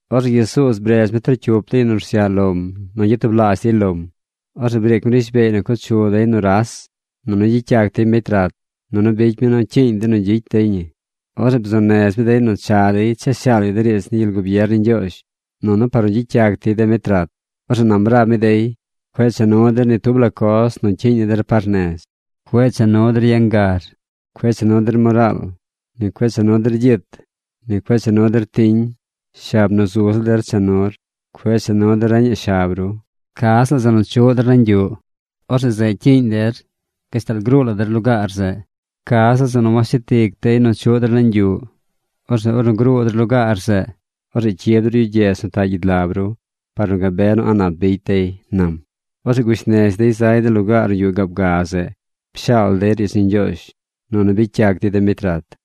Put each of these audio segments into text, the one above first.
Orzeꞌ Jesuuz bredz mi trocyup de yu nu rsyaꞌ lom nu gyatublaazh dey lom. Orzeꞌ briic mi rishbeey nu co chu dey nuras, nunu gyicy yac dey mbecy rat. Nunu bicy mi nu cyiiñ dey nu gyicy dey ñi. Orzeꞌ bzuu nez mi dey nu cha dey cha shaal yu de riidz ni gyel gubier ni Ñgyoozh, nunu par nu gyicy yac dey de mbecy rat. Orzeꞌ nam rab mi dey: ―Cueꞌ cha nu der ni tub la coz nu cyiiñ ni der par nez. Cueꞌ cha nu der yangar. Cueꞌ cha nu der moraal. Ni cueꞌ cha nu der gyit. Ni cueꞌ cha nu der tiñ. Shab nu zu ziꞌl der cha nur. Cueꞌ cha nu der reñaꞌ shab ru. Ca ziꞌl zeꞌ nu chuꞌ der nañ yuꞌ, orzeꞌ zeꞌ cyiiñ der gashtal gruu la der lugaar zeꞌ. Ca ziꞌl zeꞌ nu washet ic dey nu chuꞌ der nañ yuꞌ, orzeꞌ ornu gruu der lugaar zeꞌ, orzeꞌ cyib der yu gyedz nu taꞌ gyid lab ru par nu gabe nu a̱ꞌ nap bicy dey ―nam. Orzeꞌ gush nez dey zay de lugaar nu yuꞌ gaab ga zeꞌ. Pshaal dey riidz ni Ñgyoozh, nunu bicy yac dey de mbecy rat.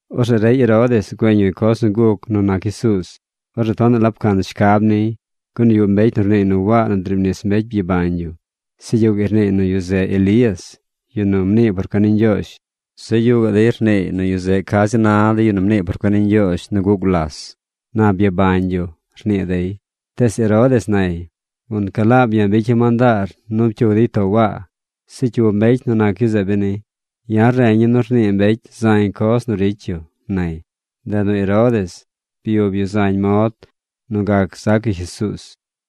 Orzeꞌ rey Herodes güeñ yu coz nu guc nu nac Jesuuz. Orzeꞌ tonaꞌ la pcan shcab niy. Gun yuꞌ mbecy nu rniiy nu Waa nu driib nis mbecy byabañ yu. Zeꞌ yuꞌ gaꞌy rniiy nu yu zeꞌ Elías, yu nu mnii por cuen ni Ñgyoozh. Zeꞌ yuꞌ gaꞌ dey rniiy nu yu zeꞌ ca zi na de yu nu mnii por cuen ni Ñgyoozh nu guꞌ gulas. Na byabañ yu, rnii dey. Tees Herodes nay: ―Gunca laab ya̱ bicya̱ mandaar nu pcyug dey too Waa. ¿Zeꞌ cyu mbecy nac yu zeꞌ beni? Ya̱ reña̱ nu rnii mbecy zañ coz nu ricy yu ―nay. Ndeꞌ nu Herodes byub yu zañ mod nu gac zac yu Jesuuz.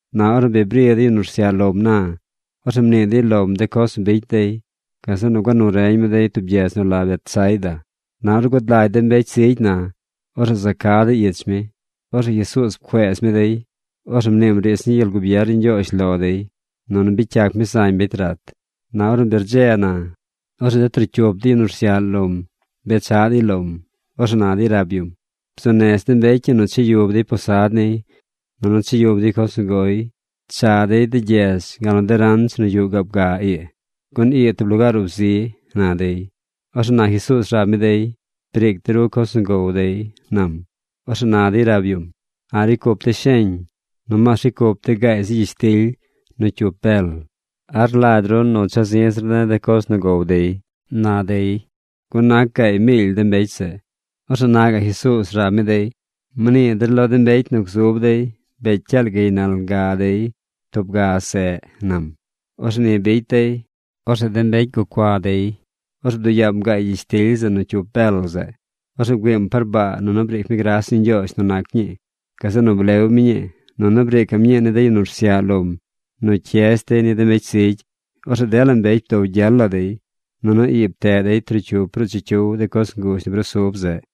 Na ornu bi bri de yu nu rsyaꞌ lom na, orzeꞌ mnii dey lom de coz nu bicy dey. Gazeꞌ nu gua nu reñ mi dey tub gyedz nu la Betsaida. Na ornu gud lagy de mbecy zigy na, orzeꞌ za ca dey ich mi. Orzeꞌ Jesuuz pcueez mi dey. Orzeꞌ mniim riidz ni gyel gubier ni Ñgyoozh lo dey. Nunu bicy yac mi zañ mbecy rat. Na ornu bi rdze na, orzeꞌ de trocyup de yu nu rsyaꞌ lom bechaꞌ dey lom. Orzeꞌ na dey rab yum: ―Bzuu nez de mbecy ii nu cha yub dey posad niy, nunu cha yub dey coz nu goy. Cha dey de gyedz gal nu de ranch nu yuꞌ gaab ga ii, gun ii tub lugaar ub zi ―na dey. Orzeꞌ na Jesuuz rab mi dey: ―Briic de ru coz nu gow dey ―nam. Orzeꞌ na dey rab yum: ―A̱ꞌ ricy cup de̱ sheñ. Nomaas ricy cup de̱ gaay zi gyishtily nu cyup bel. ¿A rlagy ru nu cha̱ zi̱ zir de̱ de coz nu gow dey? ―na dey. Gun nac gaay miily de mbecy zeꞌ. Orzeꞌ na gaꞌ Jesuuz rab mi dey: ―Mnii der lo de mbecy nu gzub dey bee cyaal gaynal ga dey tub ga seꞌ ―nam. Orzeꞌ ni bicy dey. Orzeꞌ de mbecy gucua dey. Orzeꞌ bduꞌ yaam gaay gyishtily zeꞌ nu cyup bel zeꞌ. Orzeꞌ bgüiim par baa nunu briic mi gras ni Ñgyoozh nu nac ñii. Gazeꞌ nu blew mi ñii. Nunu briicaꞌm ñii ni de yu nu rsyaꞌ lom nu cyez dey ni de mbecy zigy. Orzeꞌ dela mbecy bdow gyel la dey. Nunu ii pteꞌ dey trocyup ruꞌ chicyiw de coz nguzh nu brusub zeꞌ.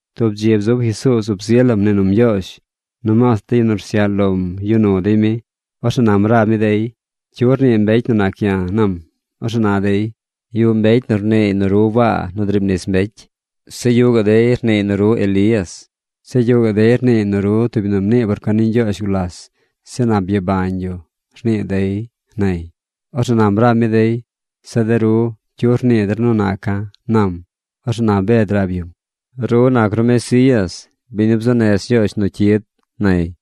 Tub dzi bzub Jesuuz ub zi lam mnii num Ñgyoozh. Nomaas de yu nu rsyaꞌ lom yuꞌ nu dey mi. Orzeꞌ nam rab mi dey: ―¿Cyu rnii mbecy nu nac ya̱? ―nam. Orzeꞌ na dey: ―Yuꞌ mbecy nu rniiy nu ru Waa nu driib nis mbecy. Zeꞌ yuꞌ gaꞌ dey rniiy nu ru Elías. Zeꞌ yuꞌ gaꞌ dey rniiy nu ru tub yu nu mnii por cuen ni Ñgyoozh gulas. Zeꞌ na byabañ yu, rnii dey ―nay. Orzeꞌ nam rab mi dey: ―Zeꞌ de ru, ¿cyu rnii der nu naca̱? ―nam. Orzeꞌ na Bed rab yum: ―Ru nac ru Mesías, biñ nu bzuu nez Ñgyoozh nu cyid ―nay.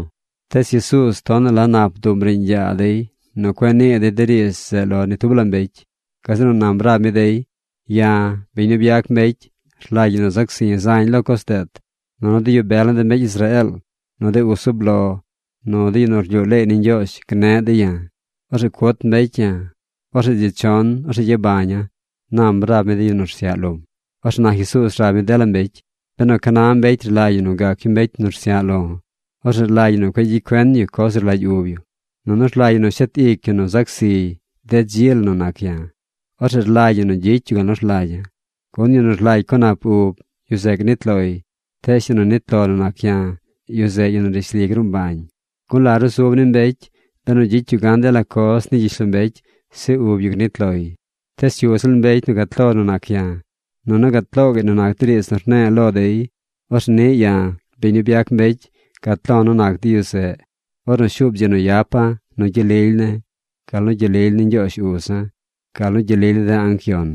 Tees Jesuuz tonaꞌ la nap bduꞌm riiñ yaa dey nu cueꞌ nii dey de riidz zeꞌ lo ni tub la mbecy. Gazeꞌ nu nam rab mi dey: ―Ya̱, biñ nu byac mbecy, rlagy ñi nu zac zi̱ zañ lo coz deet. Nunu de yu bel ni de mbecy Israeel, nu de uz zub lo, nu de yu nu rlyuu leey ni Ñgyoozh gneꞌ dey ya̱. Orzeꞌ cut mbecy ya̱. Orzeꞌ dzi chon, orzeꞌ gyabaña̱ ―nam rab mi de yu nu rsyaꞌ lom. Orzeꞌ na Jesuuz rab mi dela mbecy: ―Benu ca na mbecy rlagy yu nu gac yu mbecy nu rsyaꞌ lo̱, orzeꞌ rlagy ñi nu cueꞌ gyicy cuen yu coz nu rlagy ub yu. Nunu rlagy ñi nu shet ic yu nu zac ziy de dzi la nu nac ya̱. Orzeꞌ rlagy ñi nu gyicy yu gal nu rlagya̱. Gun yu nu rlagy co nap ub, yu zeꞌ gnit loy. Tees yu nu nit lo nu nac ya̱, yu zeꞌ yu nu rishli gruu mbañ. ¿Gun la rusub ni mbecy, benu gyicy yu gan dela coz ni gyishlombecy, zeꞌ ub yu gnit loy? Tees cyu ziꞌl mbecy nu gat lo nu nac ya̱, nunu gat loo gaꞌy nu nac de riidz nu rne̱e̱ lo dey, orzeꞌ niꞌ ya̱, biñ nu byac mbecy, gat lo̱ nu nac de yu zeꞌ, ornu shuub dzi nu yapa̱ nu gyel lily ne̱, gal nu gyel lily ni Ñgyoozh uza̱, gal nu gyel lily ni de anc yon.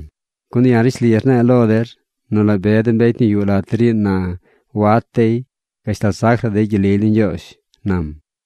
Gun ya̱ rishli rne̱e̱ lo der nu la be de mbecy nu yuꞌ lat der ii na wat dey gashtal zac la dey gyel lily ni Ñgyoozh ―nam.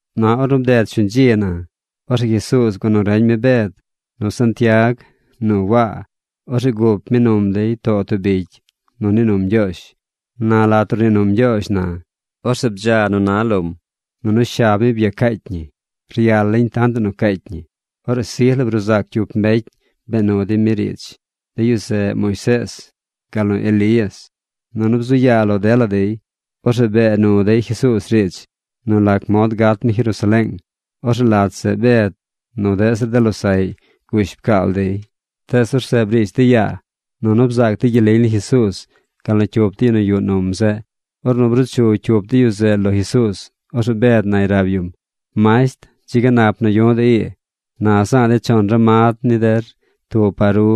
Na ornu bded shuñ dzi na, orzeꞌ Jesuuz gua nu reñ mi Bed, nu Santiag, nu Waa. Orzeꞌ gup mi num dey too tub bicy nu nii num Ñgyoozh. Na lat nu rnii num Ñgyoozh na, orzeꞌ bdza nu na lom. Nunu shab mi byacaacy ñi. Ryal lañ tantaꞌ nu caacy ñi. Orzeꞌ sij la bruu zac cyup mbecy bee nu dey mi riidz. De yu zeꞌ Moisees gal nu Elías. Nunu bzu yaa lo dela dey. Orzeꞌ bee nu dey Jesuuz riidz nu lac mod gat mi Jerusaleeng. Orzeꞌ lat zeꞌ Bed nu deꞌ zir de losaꞌy gush pcaal dey. Tees orzeꞌ briish dey yaa. Nunu bzaac dey gyel lily ni Jesuuz gal nu cyup de yu nu yuꞌ num zeꞌ. Ornu bruu chu cyup de yu zeꞌ lo Jesuuz, orzeꞌ Bed nay rab yum: ―¡Masht, dzi ga nap nu yu̱ꞌ de̱ ii! Na za̱a̱ de̱ chon ramad ni der: tub par ru,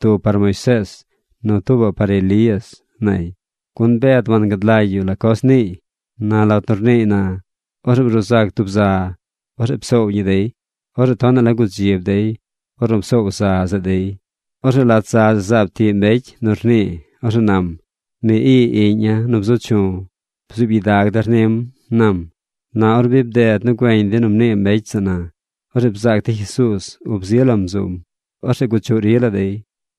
tuubaꞌ par Moisees, nu tuubaꞌ par Elías ―nay. Gun Bed wangad lagy yu la coz niiy. Na lat nu rniiy na, orzeꞌ bruu zac tub za. Orzeꞌ psoow ñi dey. Orzeꞌ tonaꞌ la gudzib dey ornu psoow za zeꞌ dey. Orzeꞌ lat za zeꞌ zaab tiꞌ mbecy nu rnii. Orzeꞌ nam: ―Mi ii iꞌña̱ nu bzu chu̱. Bzuub gyidag der nim ―nam. Na ornu bi bded nu güeñ dey nu mnii mbecy zeꞌ na, orzeꞌ bzaac dey Jesuuz ub zi lam zum. Orzeꞌ guchuꞌ ri la dey.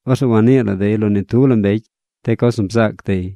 Orzeꞌ wanii la dey lo ni tub la mbecy de coz nu bzaac dey.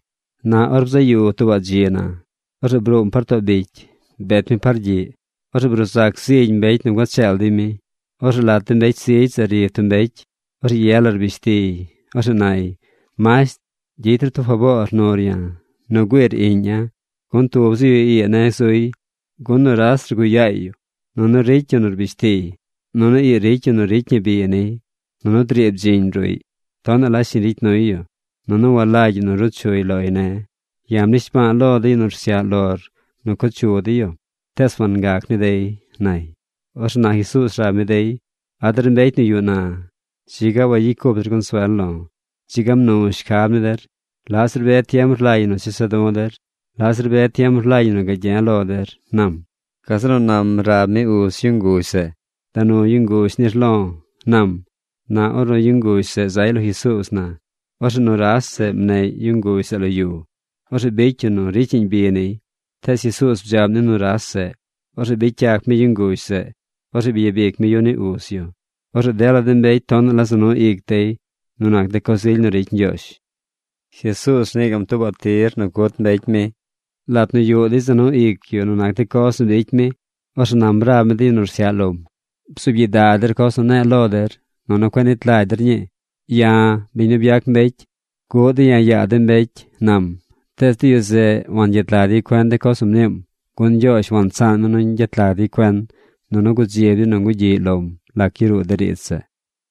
Na or bzaꞌ yu tuubaꞌ dzi na, orzeꞌ bruum par too bicy, bet mi par gyiꞌ. Orzeꞌ bruu zac zigy mbecy nu gua cheel dey mi. Orzeꞌ lat de mbecy zigy zeꞌ ri tub mbecy. Orzeꞌ ye la rbish tiy. Orzeꞌ nay: ―Masht, gyicy ru tub faboor nur ya̱ nu güiir iꞌña̱, gun tub zi yu ii ne̱ zuy. Gun nuras rguꞌ yaay yu, nunu ricy yu nu rbish tiy. Nunu ii ricy yu nu ricy ñi bi niy. Nunu driib bdziñ ruꞌy. Tonaꞌ la shiñ ricy nuy yu, nunu walagy yu nu ruu chuy loy ne̱. Ya̱ mnishba̱a̱ lo de yu nu rsyaꞌ lor nu co chu dey yu, tees wangac ni dey ―nay. Orzeꞌ na Jesuuz rab mi dey: ―¡A der mbecy nu yuꞌ na! ¡Dzi ga wagyicy cup der consuel lo̱! ¡Dzi ga mnu shcab ni der! ¿Laꞌ zir be tiem rlagy ñi nu chesa̱ du̱ der? ¿Laꞌ zir be tiem rlagy ñi nu gagye̱ lo der? ―nam. Gazeꞌ nu nam rab mi uz yu nguzh zeꞌ: ―Da nu yu nguzh nir lo̱ ―nam. Na ornu yu nguzh zeꞌ zay lo Jesuuz na, orzeꞌ nuras zeꞌ mneꞌy yu nguzh zeꞌ lo yu. Orzeꞌ bicy yu nu ricyaꞌñ bi niy. Tees Jesuuz bdzaꞌm ni nuras zeꞌ. Orzeꞌ bicy yac mi yu nguzh zeꞌ. Orzeꞌ byabic mi yu ni uz yu. Orzeꞌ dela mbecy tonaꞌ la za nu ic dey nu nac de coz ily nu ricy Ñgyoozh. Jesuuz rnii gaꞌm tuubaꞌ tir nu cut mbecy mi Lat nu yuꞌ dey za nu ic yu nu nac de coz nu bicy mi, orzeꞌ nam rab mi de yu nu rsyaꞌ lom: ―Bzuub gyidag der coz nu ne̱e̱ lo der, nunu cueꞌ nit lagy der ñii. Ya̱, biñ nu byac mbecy, guꞌ dey ya̱ yaa de mbecy ―nam. Tees de yu zeꞌ wangyet lag dey cuen de coz nu mniim. Gun Ñgyoozh wansaan mi nu ñgyet lag dey cuen. Nunu gudzib dey nu ñgugyiꞌy lom lac yaruu de riidz zeꞌ.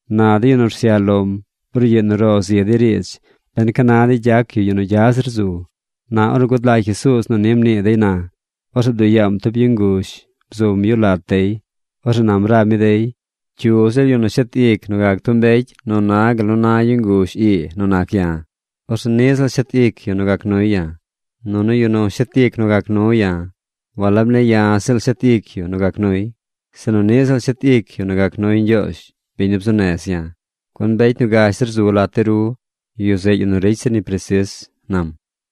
Na de yu nu rsyaꞌ lom brugyiꞌ nu ro zi dey riidz ben ca na dey gyac yu yu nu gya zir zu. Na ornu gud lagy Jesuuz nu ni mnii dey na, orzeꞌ bduꞌ yaam tub yu nguzh bzum yu lat dey. Orzeꞌ nam rab mi dey: ―Cyu ziꞌl yu nu shet ic nu gac tub mbecy nu na gal nu na yu nguzh ii nu nac ya̱, orzeꞌ niꞌ ziꞌl shet ic yu nu gac nuy ya̱. Nunu yu nu shet ic nu gac nu ya̱, walab ne̱ ya̱ ziꞌl shet ic yu nu gac nuy, sinu niꞌ ziꞌl shet ic yu nu gac nuy Ñgyoozh, biñ nu bzuu nez ya̱. Gun mbecy nu gash zir zu lat de ru, yu zeꞌ yu nu ricy zir ñi presis ―nam.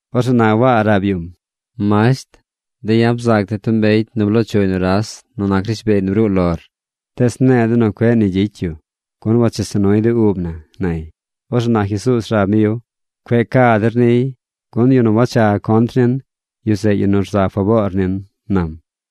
Orzeꞌ na Waa rab yum: ―Masht, de̱ ya̱ bzaac de̱ tub mbecy nu bloo chuy nuras nu nac rishbeey nu bruu lor, tees mne̱e̱ de̱ nu cueꞌ nu ni gyicy yu, gun wachesa nuy de ub na ―nay. Orzeꞌ na Jesuuz rab mi yu: ―Cueꞌ ca der niy, gun yu nu wacha contr nin, yu zeꞌ yu nu rza faboor nin ―nam.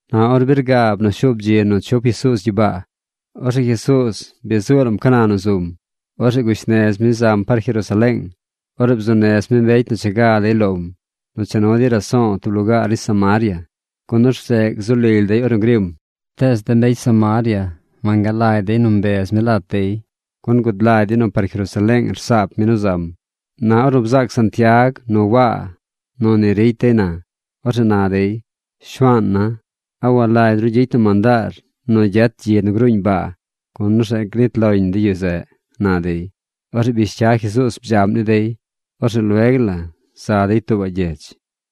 Na ornu bi rgaab nu shuub dzi nu chup Jesuuz gyibaa, orzeꞌ Jesuuz bi zuu lam ca na nu zum. Orzeꞌ gush nez mi zam par Jerusaleeng. Orzeꞌ bzuu nez mi mbecy nu cha ga dey lom nu cha nu dey raso̱o̱ tub lugaar ni Samaria. Gun orzeꞌ gzu lily dey ornu grim. Tees de mbecy Samaria wangalagy dey nu cuez mi lat dey, gun gud lagy dey nu par Jerusaleeng rsaap mi nu zam. Na ornu bzaac Santiag nu Waa nu ni ricy dey na, orzeꞌ na dey: ―Shuaana̱, ¿a walagy ru gyicy na mandaar nu gyet gyi nu gruuñ baa, gun orzeꞌ gnit loñ de yu zeꞌ? ―na dey. Orzeꞌ bish cya Jesuuz bdzaꞌm ni dey. Orzeꞌ lueg la za dey tuubaꞌ gyedz.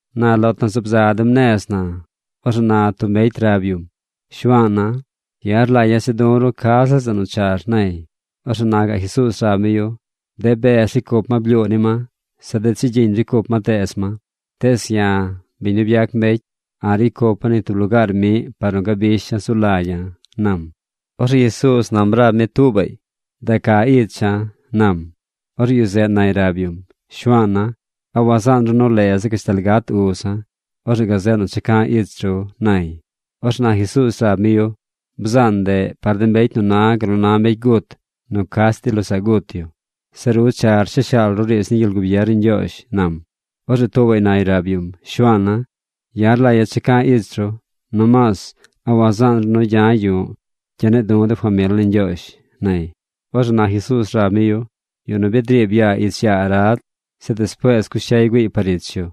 Na lat nu zaab za dem nez na, orzeꞌ na tub mbecy rab yum: ―Shuaana̱, ya̱ rlagya̱ cha du̱ ru ca ziꞌl zeꞌ nu char ―nay. Orzeꞌ na gaꞌ Jesuuz rab mi yu: ―De bez ricy cup ma blyuu ni ma. Zeꞌ de chigyiñ ricy cup ma teez ma. Tees ya̱, biñ nu byac mbecy, a̱ꞌ ricy cupa̱ ni tub lugaar miꞌ par nu gabisha̱ zu lagya̱ ―nam. Orzeꞌ Jesuuz nam rab mi tuubaꞌy: ―Da ca icha̱ ―nam. Orzeꞌ yu zeꞌ nay rab yum: ―Shuaana̱, ¿a wazaan ru leza̱ gashtal gat uza̱? Orzeꞌ gazeꞌ nu cha ca̱ ich ru ―nay. Orzeꞌ na Jesuuz rab mi yu: ―Bzaan ndeꞌ par de mbecy nu na gal nu na mbecy gut nu cach dey losaꞌ gut yu. Zeꞌ ru char cha shaal ru riidz ni gyel gubier ni Ñgyoozh ―nam. Orzeꞌ tuubaꞌy nay rab yum: ―Shuaana̱, ya̱ rlagya̱ cha ca̱ ich ru. Nomaas ¿a wazaan ru nu gya̱ yu̱ꞌ gya̱ ne̱e̱ du̱ de famil ne̱ ñgyoozh? ―nay. Orzeꞌ na Jesuuz rab mi yu: ―Yu nu bi driib yaa ich yaa arad, zeꞌ despuees cush cyay güiiy par ich yu,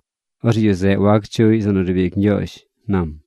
orzeꞌ yu zeꞌ wac chuꞌy zeꞌ nu riib ic Ñgyoozh ―nam.